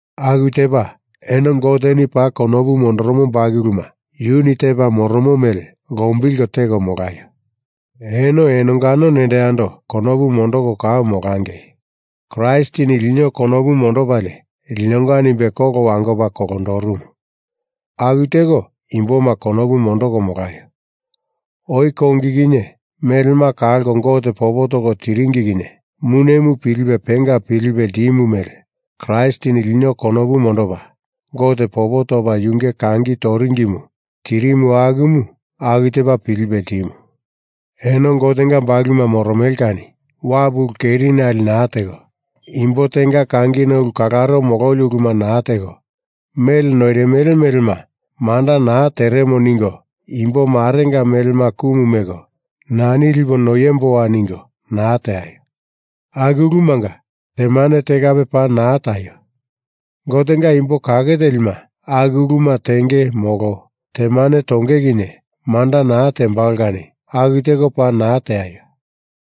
Aku tepa eno Goteni paa konopu mondoromo bakuluma yuni tepa moromo mele lombilko teko molaio. Eno enongano nendo yando konopu mondoko kau molangei. Kraistini lino konopu mondopalie linonga nimbe kolo wangopa kolondorumu aku teko imboma konopu mondoko molaio. Oi kongi kinye melema kalko Gote popo toko tiringi kinye munemu pilipe penga pilipe ltimu mele Kraistini lino konopu mondopa Gote popo topa yunge kangi toringimu tirimu akumu aku tepa pilipe ltimu. Eno Gotenga bakuluma moromele kani wapu ulu kerinali naa teko, imbo tenga kangina ulu kalaro mololi uluma naa teko, mele noirimele melema manda naa teremo ningo imbo marenga melema kumu meko nani lipo noiemboa ningo naa teaio. Aku ulumanga temane te kape paa naa taio. Gotenga imbo kake telima aku uluma tenge molo temane tonge kinye manda naa tembalo kani aku teko paa naa teaio.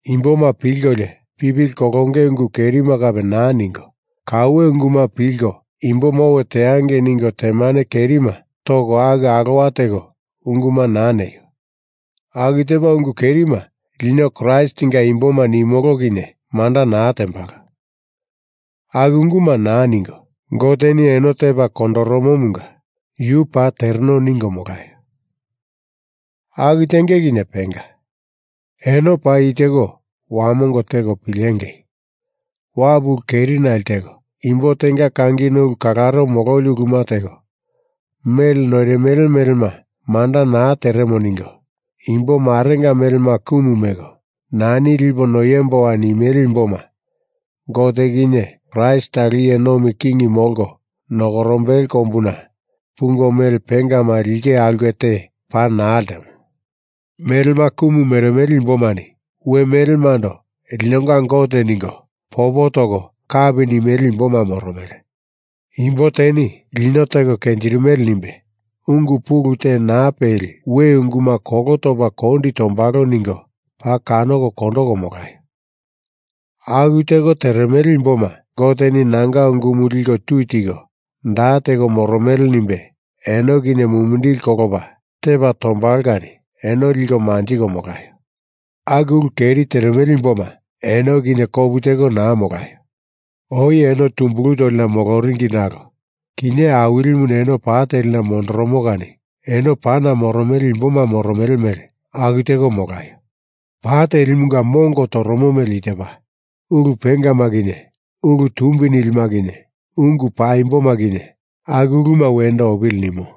Imboma pilkolio pipili kolonge ungu kerima kape naa ningo, kauwe unguma pilko imboma owe teangei ningo temane kerima toko aku alowa teko unguma naa neio. Aku tepa ungu kerima lino Kraistinga imboma nimolo kinye manda naa tembalo. Aku unguma naa ningo, Goteni eno tepa kondoromomunga yu paa tereno ningo molaio. Aku tenge kinye penga. Eno paa i teko wamongo teko pilengei: Wapu ulu kerinali teko, imbo tenga kangina ulu kalaro mololi uluma teko, mele noirimele melema manda naa teremo ningo imbo marenga melema kumu meko nani lipo noiemboa nimele imboma Gote kinye Kraist talo iye nomi king molko nokorombele kombuna pungo mele pengama linge aulke te paa naa ltemo. Melema kumu meremele imbomani we melemando linonga Gote ningo popo toko kapi nimele imboma moromele. Imbo teni lino teko kenjirimele nimbe ungu pulu te naa peli we unguma kolo topa kondi tombalo ningo paa kanoko kondoko molaio. Aku teko teremele imboma Goteni nanga ungumu liko tui tiko da teko moromele nimbe eno kinye mumindili kolopa tepa tombalo kani eno liko manjiko molaio. Aku ulu keri teremele imboma eno kinye kopu teko naa molaio. Oi eno tumbulu tolina moloringi nalo kinye Awilimuni eno pa telina mondoromo kani eno pana moromele imboma moromele mele aku teko molaio. Pa telimunga mongo toromo mele i tepa. Ulu pengama kinye ulu tumbi nilima kinye ungu paimboma kinye aku uluma wendo opili nimo.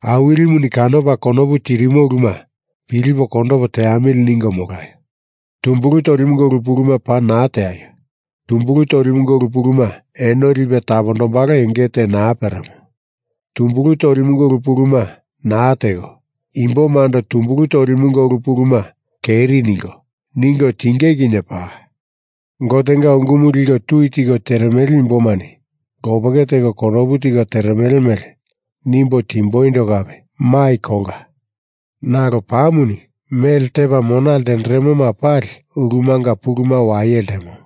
Awilimuni kanopa konopu tirimo uluma pilipo kondopo teamili ningo molaio. Tumbulu tolimunga ulu puluma paa naa teaio. Tumbulu tolimunga ulu puluma eno lipe tapondombalo enge te naa peremo. Tumbulu tolimunga ulu puluma naa teko, imbomando tumbulu tolimunga ulu puluma keri ningo, ningo tinge kinye paa. Gotenga ungumu liko tui tiko teremele imbomani lopeke teko konopu tiko teremele mele nimbo timboindo kape mai kolka. Nalo pamuni mele tepa mona ltenderemoma pali ulumanga puluma waye ltemo.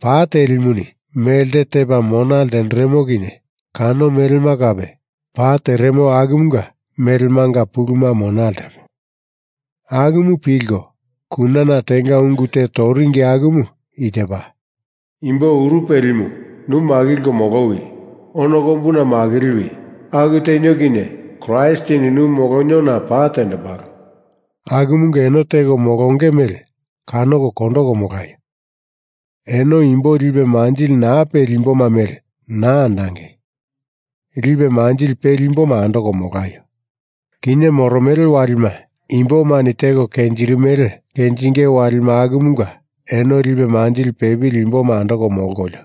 Pa telimuni melte tepa mona ltenderemo kinye kano melema kape pa teremo akumunga melemanga puluma mona ltemo. Akumu pilko kunana tenga ungu te toringi akumu i tepa: Imbo uru pelimu, nu makilko molowi. Ono kombuna makiliwi. Aku tenio kinye Kraistini nu moloniona pa tendembalo. Akumunga eno teko molonge mele kanoko kondoko molaio! Eno imbo lipe manjili naa peli imboma mele naa andangei. Lipe manjili peli imboma andoko molaio. Kinye moromele walima imbomani teko kenjirimele kenjinge walima akumunga eno lipe manjili peli imboma andoko molkolio,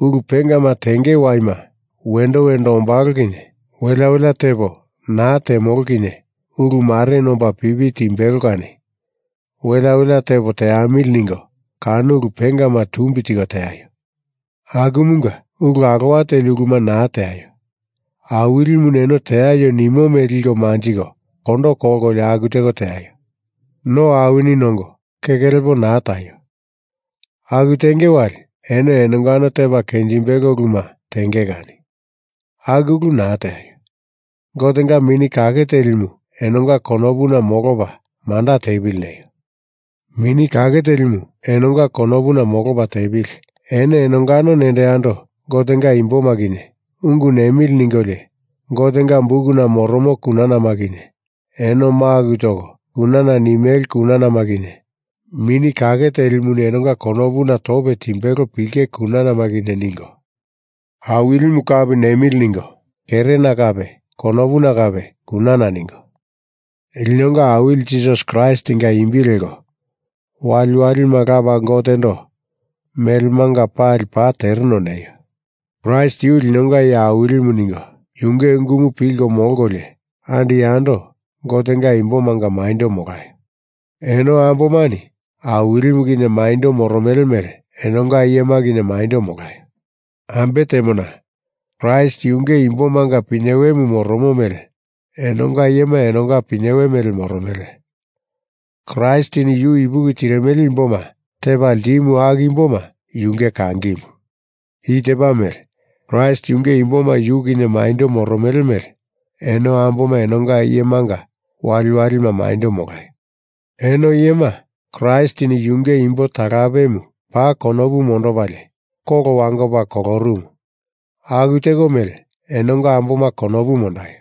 ulu pengama tenge waima wendo wendo ombalo kinye welea welea tepo naa temolo kinye ulu mareni omba pipi timbelo kani welea welea tepo teamili ningo kano ulu pengama tumbi tiko teaio. Akumunga, ulu alowa teli uluma naa teaio. Awilimuni eno teaio nimo mele liko manjiko kondokolio aku teko teaio. No awini nongo keke lepo naa taio. Aku tenge wali eno enongano tepa kenjimbelo uluma tenge kani aku ulu naa teaio. Gotenga Mini Kake Telimu enonga konopuna molopa manda tepili neio. Mini Kake Telimu enonga konopuna molopa tepili eno enongano nendo yando Gotenga imboma kinye ungu nemili ningolio Gotenga Bukuna moromo kunanama kinye eno maku toko kunana nimele kunanama kinye Mini Kake Telimuni enonga konopuna tope timbelo pilenge kunanama kinye ningo Awilimu kapi nemili ningo kerena kape konopuna kape kunana ningo linonga Awili Jisasi Kraistinga imbi leko waliwalima Lapa Gotendo melemanga pali paa tereno neio. Kraist yu linonga Iye Awilimu ningo yunge ungumu pilko molkolio andi yando Gotenga imbomanga maindo molaio. Eno ambomani Awilimu kinye maindo moromele mele enonga iyema kinye maindo molaio. Ambe temona Kraist yunge imbomanga pinyewemu moromo mele enonga iyema enonga pinyewe mele moromele. Kraistini yu ipuki tirimele imboma tepa ltimu aku imboma yunge kangimu. I tepa mele Kraist yunge imboma yu kinye maindo moromele mele eno amboma enonga iyemanga waliwalima maindo molaio. Eno iyema, Kraistini yunge imbo talapemu paa konopu mondopalie kolo wangopa kolorumu aku teko mele enonga amboma konopu mondaio.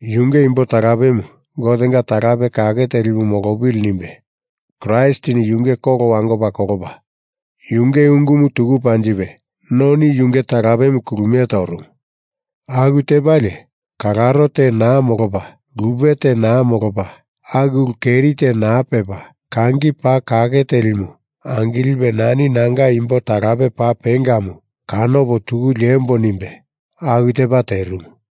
Yunge imbo talapemu Gotenga talape kake telimu molopili nimbe Kraistini yunge kolo wangopa kolopa, yunge ungumu tuku panjipe noni yunge talapemu kulumie torumu. Aku tepalie kalaro te naa molopa lupe te naa molopa, aku ulu keri te naa pepa, kangi paa kake telimu angilipe nani nanga imbo talape paa pengamu kanopo tuku liembo nimbe aku tepa terimu.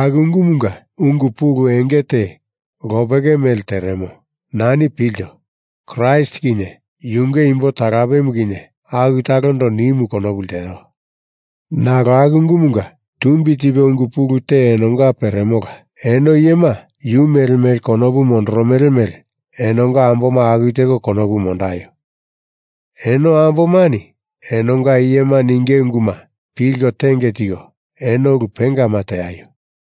Aku ungumunga ungu pulu enge te lopeke mele teremo. Nani pilto, Kraist kinye yunge imbo talapemu kinye aku talondo nimu konopu lteo. Nalo aku ungumunga tumbi tipe ungu pulu te enonga peremola. Eno iyema yu mele mele konopu mondoromele mele enonga amboma aku teko konopu mondaio. Eno ambomani enonga iyema ninge unguma pilko tenge tiko eno ulu pengama teaio.